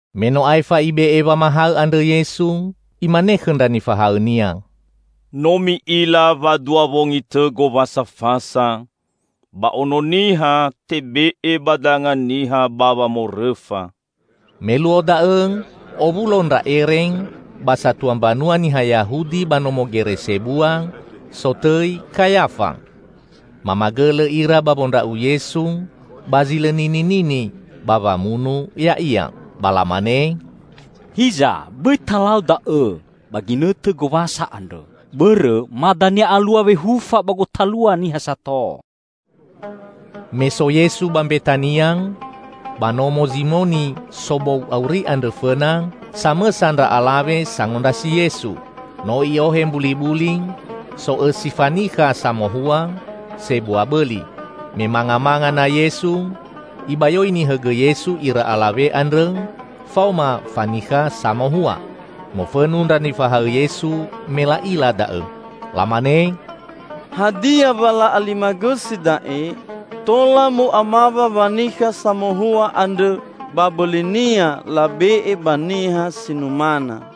Me no aefa Ibe'e wamahaõ andrõ Yesu, Imane khõ ndra nifahaõ-Nia, "No mi'ila wa dua wongi tõ Gowasa Fasa, ba Ono Niha tebe'e ba danga niha ba wamorõfa!" Me luo da'õ owulo ndra ere ba satua mbanua niha Yahudi ba nomo gere sebua sotõi Kayafa. Mamagõlõ ira ba wondra'u Yesu ba zi lõ nininini, ba wamunu Ya'ia. Ba lamane, "Hiza bõi talau da'õ ba ginõtõ Gowasa andrõ, bõrõ ma dania alua wehufa ba gotalua niha sato." Me so Yesu ba Mbetania, ba nomo Zimoni sobou auri andrõ fõna, samõsa ndra alawe sangondrasi Yesu. No i'ohe mbulibuli, so'õsi fanikha samohua sebua bõli. Me mangamanga na Yesu, ibayoini hõgõ Yesu ira alawe andrõ faoma fanikha samohua. Mofõnu ndra nifahaõ Yesu me la'ila da'õ. Lamane, "Hadia wa la'alimagõsi da'e?" "Tola mu'amawa wanikha samohua andrõ ba bõlinia labe'e ba niha si numana!"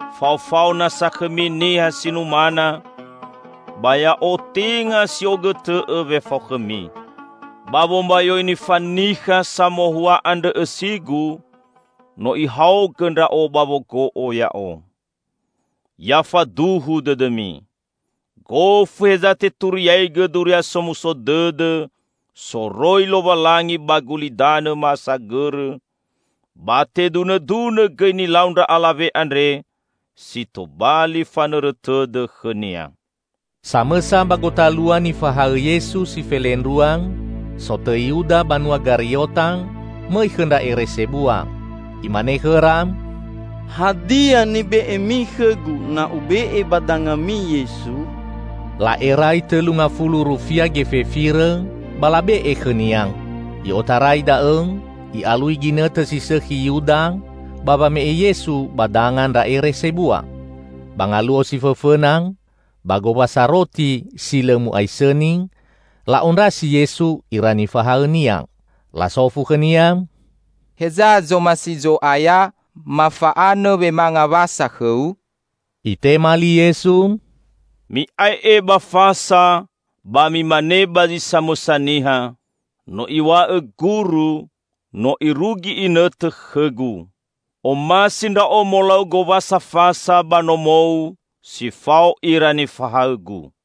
Faofao nasa khõmi niha si numana ba Ya'o tenga si'ogõtõ'õ wefao khõmi. Ba wombayoini fanikha samohua andrõ õsi-Gu, no ihaogõ Ndra'o ba wogo'o Ya'o. Ya faduhu dõdõmi! Gofu heza teturiaigõ Duria Somuso Dõdõ soroi Lowalangi ba gulidanõ ma'asagõrõ, ba tedunõdunõ gõi nilau ndra alawe andre si tobali fanõrõ tõdõ khõnia." Samõsa ba gotalua nifahaõ Yesu si felendrua, sotõi Yuda banua Gariota, mõi khõ ndra ere sebua. Imane khõra, "Hadia nibe'emi khõgu na ube'e ba dangami Yesu?" La'erai tõlu ngafulu rufia gefe firõ, ba labe'e khõnia. I'otarai da'õ i'alui ginõtõ si sõkhi Yuda ba wame'e Yesu ba danga ndra ere sebua. Ba ngaluo si fõfõna ba Gowasa Roti Si Lõ Mu'aisõni, la'ondrasi Yesu ira nifahaõ-Nia. Lasofu khõ-Nia, "Heza zomasi Zo'aya mafa'anõ wemanga Wasa khõ-U?" Itema li Yesu, "Mi'ae'e ba fasa, ba mimane ba zi samõsa niha, 'No Iw̃a'õ Guru, no irugi inõtõ khõ-Gu; Omasi Ndra'o molau Gowasa Fasa ba nomou si fao ira nifahaõ-Gu.'"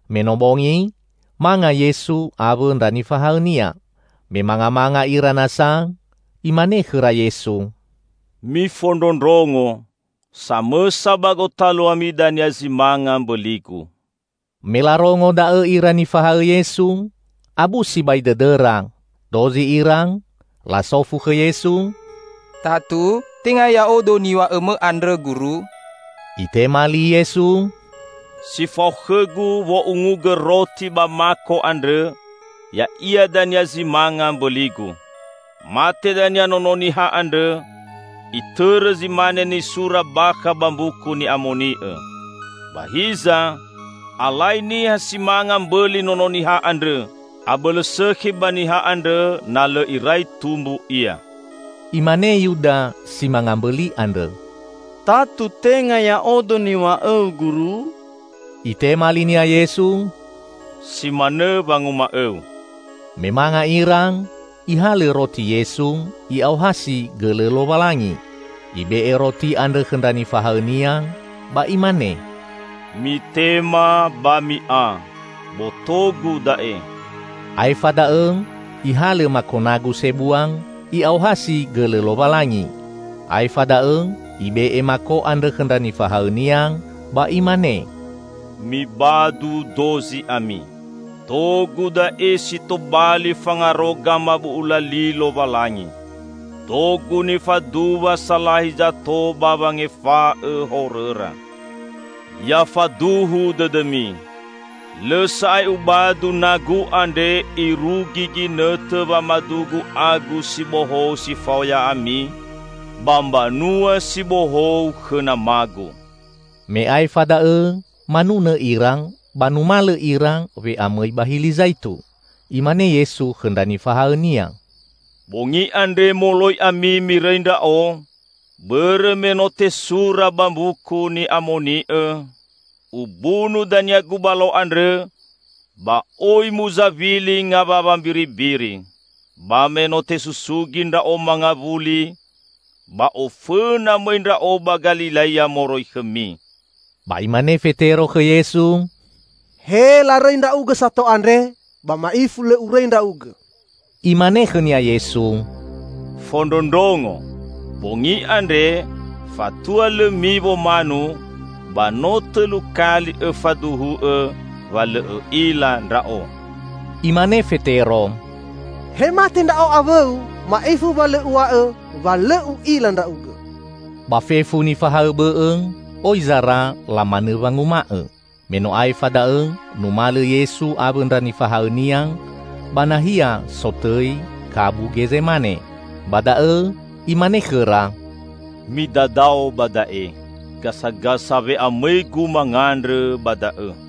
Me no bongi, manga Yesu awõ ndra nifahaõ-Nia. Me mangamanga ira nasa Imane khõra Yesu, "Mifondrondrongo: Samõsa ba gotaluami dania zi manga mbõli-Gu." Me larongo da'õ ira nifahaõ Yesu, abu sibai dõdõra. Dozi ira lasofu khõ Yesu, "Tatu, tenga ya'odo niw̃a'õ-Mõ andrõ, Guru?" Itema li Yesu, "Si fao khõ-Gu wo'ungugõ roti ba mako andrõ, ya'ia dania zi manga mbõli-Gu. Mate dania Nono Niha andrõ, itõrõ zi mane nisura bakha ba Mbuku Ni'amoni'õ. Ba hiza, alai niha si manga mbõli Nono Niha andrõ! Abõlõ sõkhi ba niha andrõ na lõ irai tumbu ia!" Imane Yuda si manga mbõli andrõ, "Tatu, tenga ya'odo niw̃a'õu Guru?" Itema linia Yesu, "Si manõ wanguma'õu!" Me manga ira, Ihalõ roti Yesu, I'aohasi gõlõ Lowalangi. Ibe'e roti andrõ khõ ndra nifahaõ-Nia ba Imane, "Mitema, ba mi'a; boto-Gu da'e." Aefa da'õ Ihalõ mako nagu sebua, I'aohasi gõlõ Lowalangi. Aefa da'õ Ibe'e mako andrõ khõ ndra nifahaõ-Nia, ba Imane, "Mibadu dozi ami. Do-Gu da'e si tobali fangaro gamabu'ula li Lowalangi. Do-Gu nifaduwa salahi zato ba wangefa'õ horõra. Ya faduhu dõdõmi: Lõ sa'ae ubadu na-Gu andre irugi ginõtõ wamadu-Gu agu si bohou si fao ya'ami, ba Mbanua si Bohou khõ Nama-Gu." Me aefa da'õ manunõ ira, ba numalõ ira we'amõi ba Hili Zaitu. Imane Yesu khõ ndra nifahaõ-Nia, "Bongi andre moloi ami mirõi Ndra'o; bõrõ me no tesura ba Mbuku Ni'amoni'õ: 'Ubunu dania gubalo andrõ, ba oi muzawili ngawawa mbiribiri.' Ba me no tesusugi Ndra'o mangawuli, ba ofõna mõi Ndra'o ba Galilea moroi khõmi." Ba imane Fetero khõ Yesu, "He larõi Ndra'ugõ sato andrõ, ba ma'ifu lõ urõi Ndra'ugõ!" Imane khõnia Yesu, "Fondrondrongo: Bongi andre, fatua lõ miwo manu, ba no tõlu kali õfaduhu'õ wa lõ õ'ila Ndra'o." Imane Fetero, "He mate ndra'o awõ-U, ma'ifu wa lõ uw̃a'õ wa lõ u'ila Ndra'ugõ!" Ba fefu nifahaõ bõ'õ oi zara lamanõ wanguma'õ. Me no aefa da'õ numalõ Yesu awõ ndra nifahaõ-Nia ba nahia sotõi Kabu Gezemane. Ba da'õ Imane khõra, "Midadao ba da'e, gasagasa we'amõi-Gu mangandrõ ba da'õ."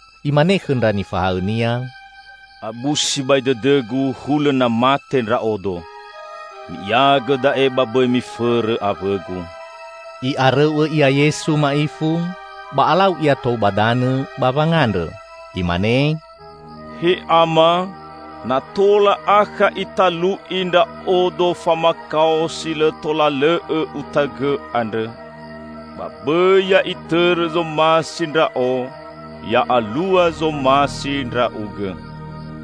Imane khõ ndra nifahaõ-Nia, "Abu sibai dõdõ-Gu, hulõ na mate Ndra'odo. Mi'iagõ da'e ba bõi mifõrõ awõ-Gu." I'arõu'õ Ia Yesu ma'ifu, ba alau Ia tou ba danõ ba wangandrõ. Imane, "He Ama, na tola akha italu'i Ndra'odo famakao si lõ tola lõ'õ Utaõgõ andrõ. Ba bõi ya'itõrõ zomasi Ndra'o, ya'alua zomasi Ndra'ugõ."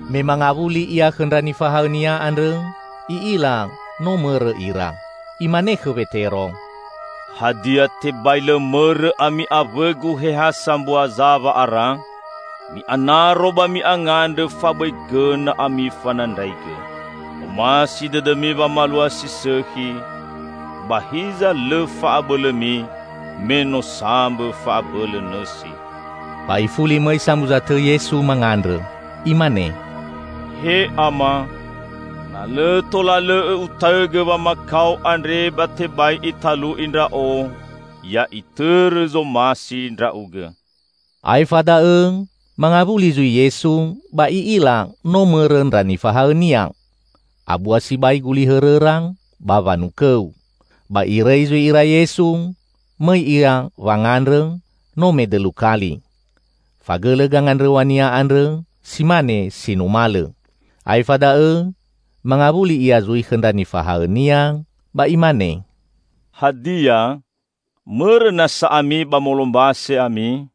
Me mangawuli Ia khõ ndra nifahaõ-Nia andrõ, I'ila no mõrõ ira. Imane khõ Wetero, "Hadia, tebai lõ mõrõ ami awõ-Gu he ha sambua za wa'ara? Mi'anaro ba mi'angandrõ fabõi gõna ami fanandraigõ. Omasi dõdõmi wamalua si sõkhi, ba hiza lõ fa'abõlõmi, me no sambõ fa'abõlõ nõsi." Ba Ifuli mõi samuza tõ Yesu mangandrõ. Imane, "He Ama, na lõ tola lõ'õ Utaõgõ wamakao andre ba tebai italu'i Ndra'o, ya itõrõ zomasi Ndra'ugõ." Aefa da'õ mangawuli zui Yesu, ba I'ila no mõrõ ndra nifahaõ-Nia. Abua sibai guli hõrõra ba wanukõu. Ba Irõi zui ira Yesu, mõi Ia wangandrõ, no medõlu kali. Fagõlõ gangandrõw̃a-Nia andrõ si mane si numalõ. Aefa da'õ mangawuli Ia zui khõ ndra nifahaõ-Nia ba Imane, "Hadia, mõrõ nasa ami ba molombase ami?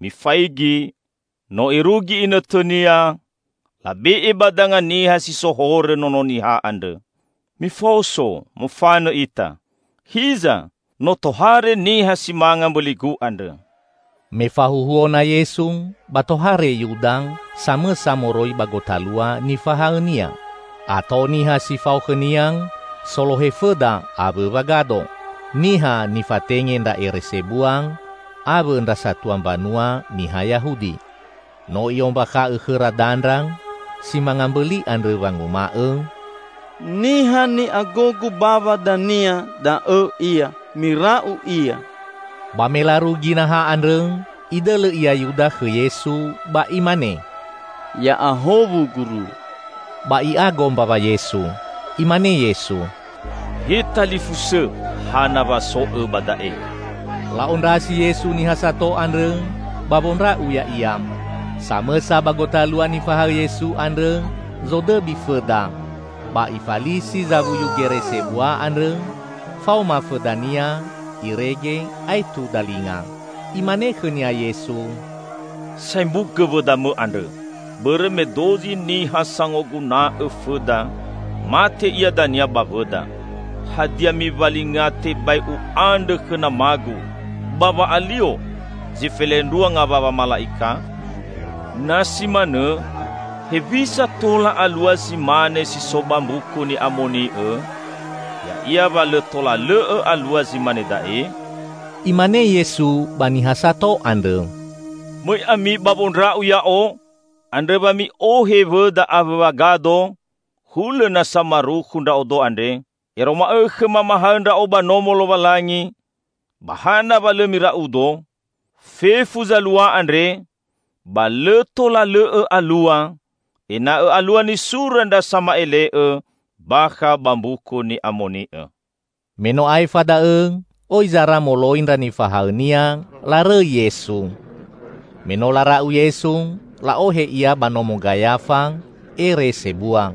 Mifaigi, no irugi inõtõnia, labe'e ba danga niha si so horõ Nono Niha andrõ. Mifaoso, mofanõ ita. Hiza! No tohare niha si manga mbõli-Gu andrõ!" Me fahuhuo na Yesu, ba tohare Yuda, samõsa moroi ba gotalua nifahaõ-Nia. Ato niha si fao khõnia solohe fõda awõ wagado. Niha nifatenge ndra ere sebua awõ ndra satua mbanua niha Yahudi. No i'ombakha'õ khõra dandra si manga mbõli andrõ wanguma'õ, "Niha ni'agogu bawa dania, da'õ Ia. Mira'u Ia!" Ba me larugi naha andrõ, idõlõ ia Yuda khõ Yesu ba imane, "Ya'ahowu, Guru!" Ba i'ago mbawa Yesu. Imane Yesu, "He talifusõ, hana wa so'õ ba da'e!" La'ondrasi Yesu niha sato andrõ ba wondra'u Ya'ia. Samõsa ba gotalua nifahaõ Yesu andrõ zodõbi fõda, ba ifalisi zawuyu gere sebua andrõ faoma fõdania irege aetu dalinga. Imane khõnia Yesu, "Saembugõ wõdamõ andrõ, bõrõ me dozi niha sangoguna'õ fõda mate ia dania ba wõda. Hadia miwalinga tebai U'andrõ khõ nama-Gu ba wa'alio zi felendrua ngawawa mala'ika? Na si manõ, hewisa tola alua zi mane si so ba Mbuku Ni'amoni'õ, ya'ia wa lõ tola lõ'õ alua zi mane da'e?" Imane Yesu ba niha sato andrõ, "Mõi ami ba wondra'u Ya'o, andrõ wa mi'ohe wõda awõ wagado, hulõ na samarukhu Ndra'odo andre? Ero ma'õkhõ mamahaõ Ndra'o ba Nomo Lowalangi, ba hana wa lõ mira'u-Do? Fefu zalua andre, ba lõ tola lõ'õ alua, ena'õ alua nisura ndra sama'ele'õ bakha ba Mbuku Ni'amoni'õ." Me no aefa da'õ oi zara moloi ndra nifahaõ-Nia larõi Yesu. Me no lara'u Yesu, la'ohe Ia ba nomo Gayafa, ere sebua.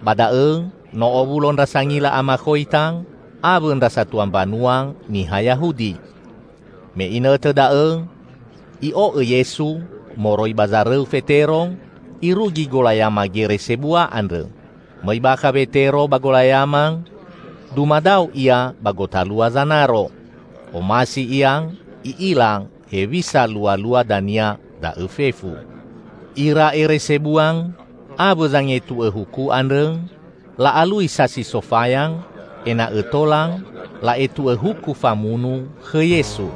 Ba da'õ no owulo ndra sangila amakhoita awõ ndra satua mbanua niha Yahudi. Me inõtõ da'õ i'o'õ Yesu moroi ba zarõu Fetero irugi golayama gere sebua andrõ. Mõi bakha Wetero ba golayama, dumadao ia ba gotalua zanaro. Omasi ia i'ila hewisa lualua dania da'õ fefu. Ira ere sebua awõ zangetu'õ huku andrõ la'alui sasi sofaya ena'õ tola la'etu'õ huku famunu khõ Yesu.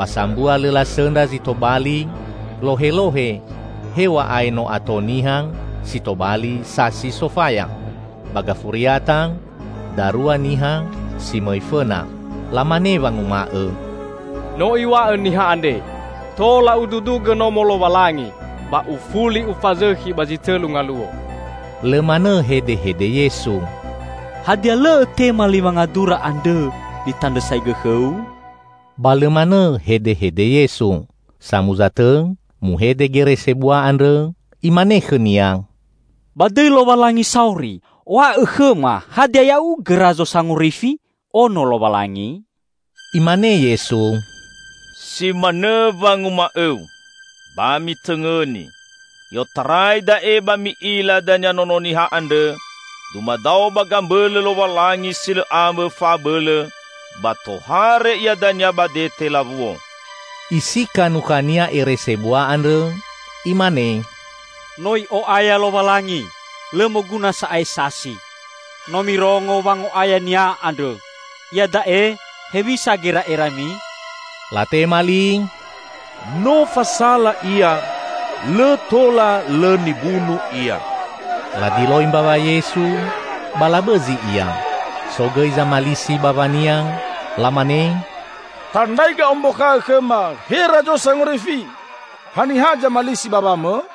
Ba sambua lõ lasõndra zi tobali lohelohe, hew̃a'ae no ato niha si tobali sasi sofaya. Ba gafuriata, darua niha si mõi fõna. Lamane wanguma'õ, "No iw̃a'õ niha andre, 'Tola Ududugõ Nomo Lowalangi, ba Ufuli Ufazõkhi ba zi tõlu ngaluo!'" Lõ manõ hedehede Yesu, "Hadia lõ Õtema li wangadura andrõ nitandrõsaigõ khõ-U?" Ba lõ manõ hedehede Yesu. Samuza tõ muhede gere sebua andrõ imane khõ-Nia, "Ba dõi Lowalangi sauri, w̃a'õ khõma hadia Ya'ugõ Razo Sangorifi, Ono Lowalangi?" Imane Yesu, "Si manõ wanguma'õu. Ba mitõngõni: I'otarai da'e ba mi'ila dania Nono Niha andrõ dumadao ba gambõlõ Lowalangi si lõ ambõ fa'abõlõ, ba tohare Ia dania ba dete lawuo!" Isika nukhania Ere sebua andrõ, imane, "No i'o'aya Lowalangi! Lõ moguna sa'ae sasi. No mirongo wango'aya-Nia andrõ. Iada'e, hewisa gera'erami?" Latema li, "No fasala Ia, lõ tola lõ nibunu Ia." Ladiloi mbawa Yesu, ba labõzi Ia. So gõi zamalisi bawa-Nia, lamane, "Tandraigõ ombakha'õ khõma, he Razo Sangorifi! Haniha zamalisi bawa-Mõ?"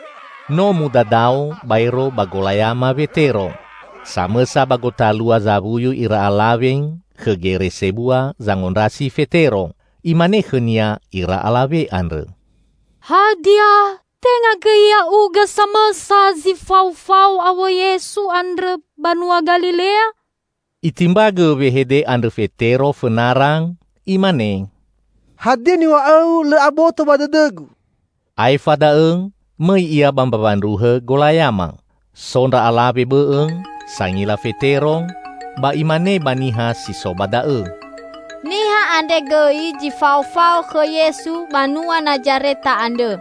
No mudadao baero ba golayama Wetero. Samõsa ba gotalua zawuyu ira alawe khõ gere sebua zangondrasi Fetero. Imane khõnia ira alawe andrõ, "Hadia, tenga gõi ya'ugõ samõsa zi faofao awõ Yesu andrõ banua Galilea?" Itimbagõ wehede andrõ Fetero fõnara imane, "Hadia niw̃a'õu, lõ aboto ba dõdõgu?" Aefa da'õ mõi ia ba mbawa ndruhõ golayama. So ndra alawe bõ'õ sangila Fetero, ba imane ba niha si so ba da'õ, "Niha andre gõi zi faofao khõ Yesu banua Nazareta andrõ."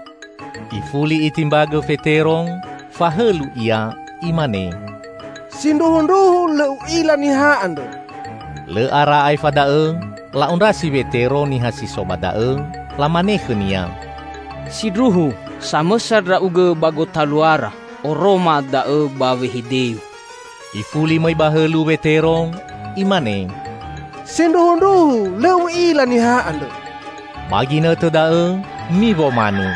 Ifuli itimbagõ Fetero, fahõlu ia imane, "Sindruhundruhu lõ u'ila niha andrõ!" Lõ ara aefa da'õ la'ondrasi Wetero niha si so ba da'õ, lamane khõnia, "Sindruhu, samõsa ndra'ugõ ba gotaluara. Oroma da'õ ba wehedeu." Ifuli mõi ba hõlu Wetero imane, "Sindruhundruhu, lõ u'ila niha andrõ!" Ba ginõtõ da'õ miwo manu.